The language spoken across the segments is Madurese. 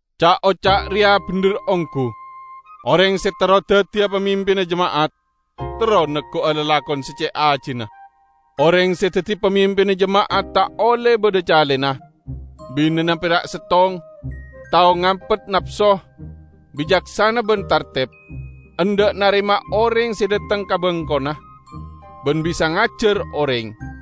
Ca'-oca' reya bendher onggu: "Oreng se terro daddiya pamimpinna jema'at, terro neggu'a lalakon se ce' ajina." Oreng se daddi pamimpinna jema'at ta' olle badha calena, binena pera' settong, tao ngampet napso, bicaksana ban tarteb; endha' narema oreng se dhateng ka bengkona, ban bisa ngajar oreng;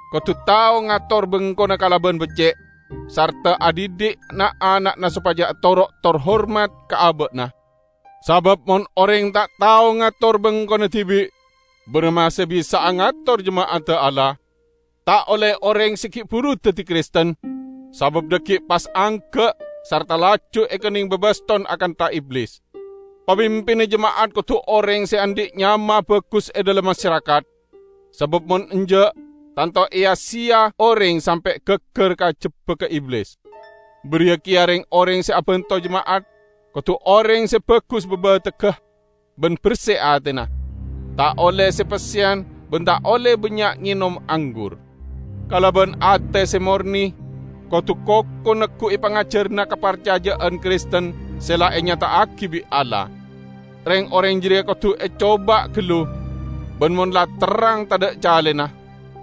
Kodu tao ngator bengkona kalaban becce', sarta adhidhi' na'-ana'na sopaja atoro' tor hormat ka aba'na. Sabab mon oreng ta' tao ngator bengkona dibi', baramma se bisa'a ngator jema'adda Allah? Ta' olle oreng se gi' buru daddi Kristen, sabab dhaggi' pas angga' sarta laju ekenneng babaston akantha Iblis. Pamimpinna jema'at kodu oreng se andhi' nyama bagus e dhalem masarakat, sabab mon enja', tanto eya-seya oreng sampe' gaggar ka jebbagga Iblis. Bariya keya reng-oreng se abanto jema'at kodu oreng se bagus babategga ban berse atena; ta' olle se-pesseyan ban ta' olle bannya' ngenom anggur. Kalaban ate se morne kodu koko neggu'i pangajaranna kaparcaja'an Kristen se la enyata'agi bi' Allah. Reng-oreng jareya kodu ecoba gallu, ban mon la terrang tadha' calena,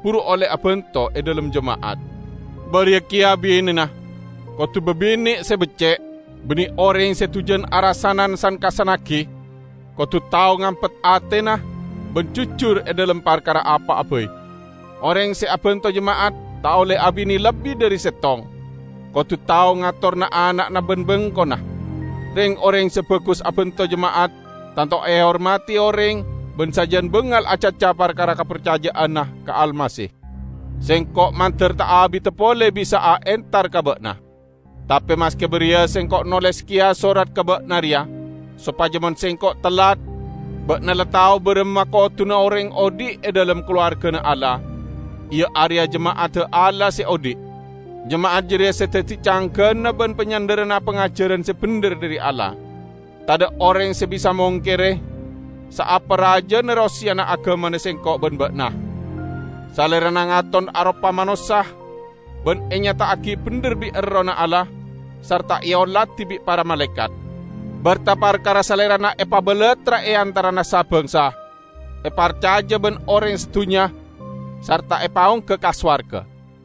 buru olle abanto e dhalem jema'at. Bariya keya binena kodu babine' se becce', banne oreng se dujan arasanan san-kassannagi; kodu tao ngampet atena ban jujur e dhalem parkara apa'a bai. Oreng se abanto jema'at ta' olle abine lebbi dhari settong. Kodu tao ngator na'-ana'na ban bengkona. Reng-oreng se bagus abanto jema'at tanto ehormadi oreng ban sajan bangal acaca parkara kaparcaja'anna ka Almasih. Sengko' mandar ta' abida pole bisa'a entar ka ba'na. Tape maske bariya sengko' noles keya sorat ka ba'na reya, sopaja mon sengko' tellat, ba'na la tao baramma koduna oreng odhi' e dhalem kalowargana Allah, iya areya jema'adda Allah se odhi'. Jema'at jareya se daddi canggana ban panyandharanna pangajaran se bendher dhari Allah. Tadha' oreng se bisa mongkere, saapa rajana roseyana agamana sengko' ban ba'na: Salerana ngaton aropa manossa, ban enyata'agi bendher bi' Errohna Allah, sarta eoladi bi' para malaekat. Berta parkara Salerana epabalattra e antarana sa-bangsa, eparcaja ban oreng sadunnya sarta epaongga ka sowarga.